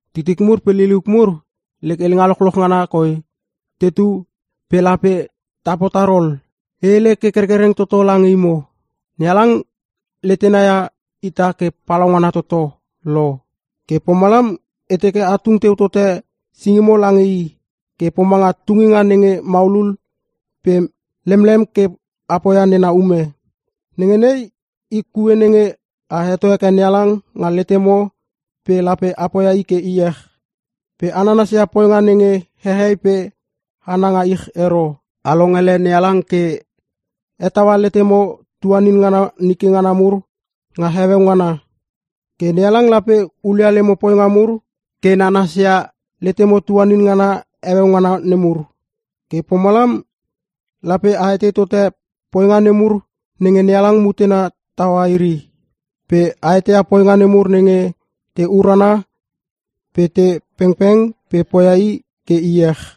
Titik mur pe liliuk mur, lek helenga lochloch ngana koi tetu pe lape ta potar ol? E hele ke kerkereng toto lange imo. NeHalang letena ia ita ke palaungana toto lo. Ke pomalam e teke a tung teu tote singimo lange i ke pomanga tunginga nenge maulul pe lemlem ke a poia nena ume. Nenge nei i kue nenge a heto heke NeHalang nga letemo pe lape poia i ke iech. Pe a nanasia poinga nenge hehei pe hana nga ich ero, a longele NeHalang ke hetaua letemo tuanin ngana nike ngana mur nga heueu ngana. Ke NeHalang lape hulia lemo poinga mur ke nanasia letemo tuanin ngana heueu ngana nemur. Ke pomalam lape a etei tote poinga nemur nenge NeHalang mutena taua iri, pe a eteia poinga nemur nenge te urana pe te pengpeng pe poia i ke iech.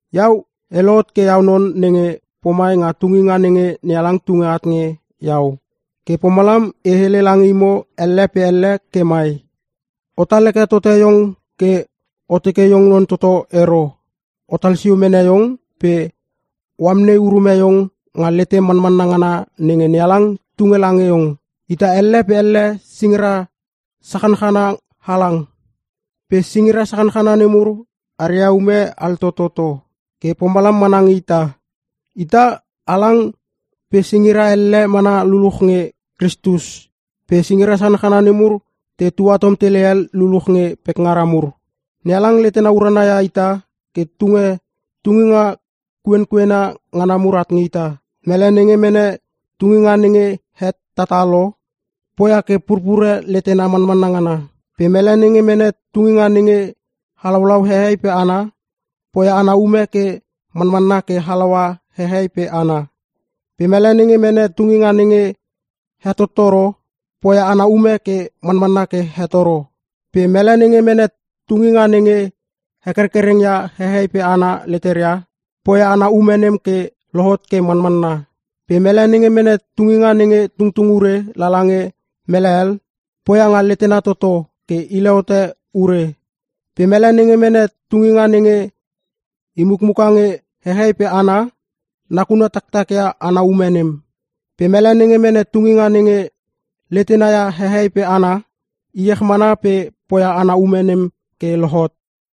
Iau e lohot ke iau non nenge pomai nga tunginga nenge NeHalang tunge at nge iau. Ke pomalam e hele lange imo elle pe elle ke mai: Otal heke tote iong ke o teke iong non toto ero. Otal sio mene iong pe o amnei urume iong nga letem manmanna ngana nenge NeHalang tunge lange iong. Ita elle pe elle singira sachanchana halang. Pe singira sachanchana nemur aria ume altototo. Ke pomalam mana nge ita. Ita halang pe singira elle mana luluch nge Kristus pe singira sachanchana nemur te tuatom tele hel luluch nge pekngaria mur. NeHalang letena urana ia ita ke tunge tunginga kuenkuena ngana mur at nge ita. Mele nenge mene tunginga nenge hetatatalo, poia ke purpure letena manmanna ngana. Pe mele nenge mene tunginga nenge halaulaua hehei pe hana, poia ana ume ke manmanna ke halaua hehei pe hana. Pe mele nenge mene tunginga nenge hetottoro, poia ana ume ke manmanna ke hetoro. Pe mele nenge mene tunginga nenge he kerkerkereng ia hehei pe hana leteria, poia ana ume nem ke lohot ke manmanna. Pe mele nenge mene tunginga nenge tungtung ure lala nge mele hel, poia nga letena toto ke hile hote ure. Pe mele nenge mene tunginga nenge i mukmuka nge hehei pe hana, nakuna taktakia ana ume nem. Pe mele nenge mene tunginga nenge letena ia hehei pe hana, iech mana pe poia ana ume nem ke lohot.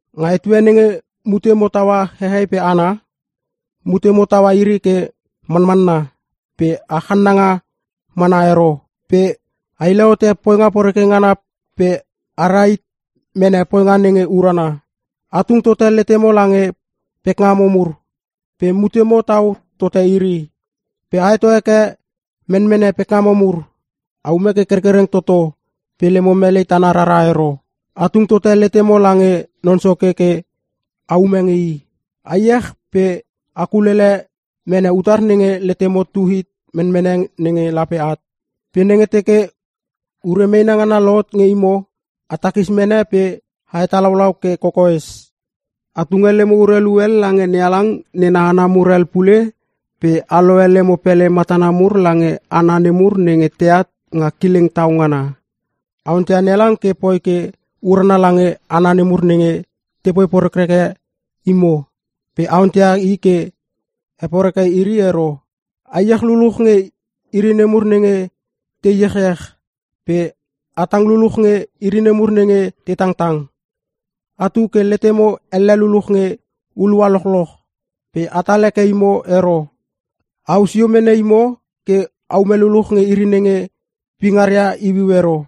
Nga etue nenge mutemo taua hehei pe hana, mutemo taua iri ke manmanna pe a channanga mana ero. Pe a hile hote poinga poreke ngana pe a rahit mene poinga nenge urana. A tung tote letemo lange pekngamo mur pe mutemo tau tote iri. Pe a heto heke menmene pekngamo mur. A ume ke kerkereng toto pe lemo melei tana rara ero. A tung tote letemo lange Non Soke ke a ume nge i. A iech pe a kulele mene utar nenge letemo tu hit menmene nenge lape at. Pe nenge teke ure meena ngana lohot nge imo a takis mene pe a hetalaulau ke kokoes. A tunge lemo urelu hel lange NeHalang nena hana mur hel pule pe a lohe lemo pele matana mur lange hana nemur nenge teat nga kileng tau ngana. A onteia NeHalang ke poi ke urana lange hana nemur nenge tepoi porekreke imo pe a onteia i ke he poreke iri ero. A iech luluch nge iri nemur nenge te iechiech pe a tang luluch nge iri nemur nenge te tangtang. Atu ke letemo elle luluch nge hulua lochloch pe atal heke imo ero, a au sio mene imo ke aume luluch nge iri nenge pingaria iuiu ero.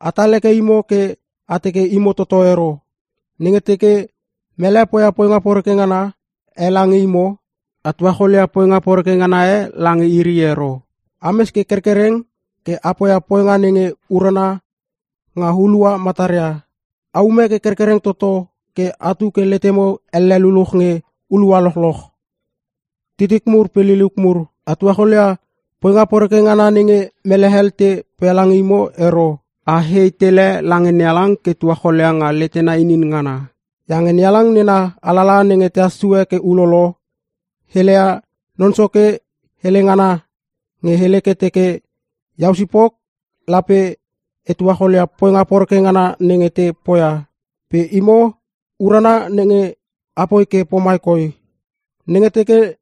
Atal heke imo ke a teke imo toto ero. Nenge teke mele poia poinga poreke ngana e lange imo, a tuacholia poinga poreke ngana e lange iri ero. Ames ke kerkereng ke a poia poinga nenge urana nga hulua mataria. A ume ke kerkereng toto ke atu ke letemo elle luluch nge hulua lochloch. Titik mur pe liliuk mur, a tuacholia poinga poreke ngana nenge mele hel te poia lange imo ero. A hei tele lange NeHalang ke tuacholia nga letena inin ngana. Iange NeHalang nena alalaha nenge tehas sue ke ulolo, heleia Non Soke hele ngana nge hele ke teke, “Iau sipok lape e tuacholia poinga poreke ngana nenge te poia.” Pe imo, urana nenge apoi ke pomai koi, “Nenge teke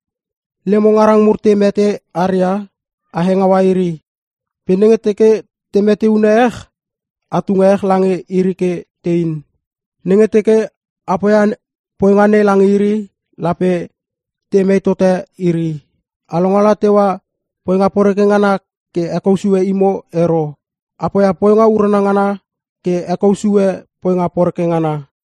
lemo ngarang mur te mete aria, a hengaua iri. Pe nenge teke te meteune ech, a tunge ech lange iri ke tein. Nenge teke a poia poinga nei lange iri, lape temei tote iri.” A longala teua poinga poreke ngana ke hekou sue imo ero. A poia poinga urana ngana ke a hekou sue poinga poreke ngana.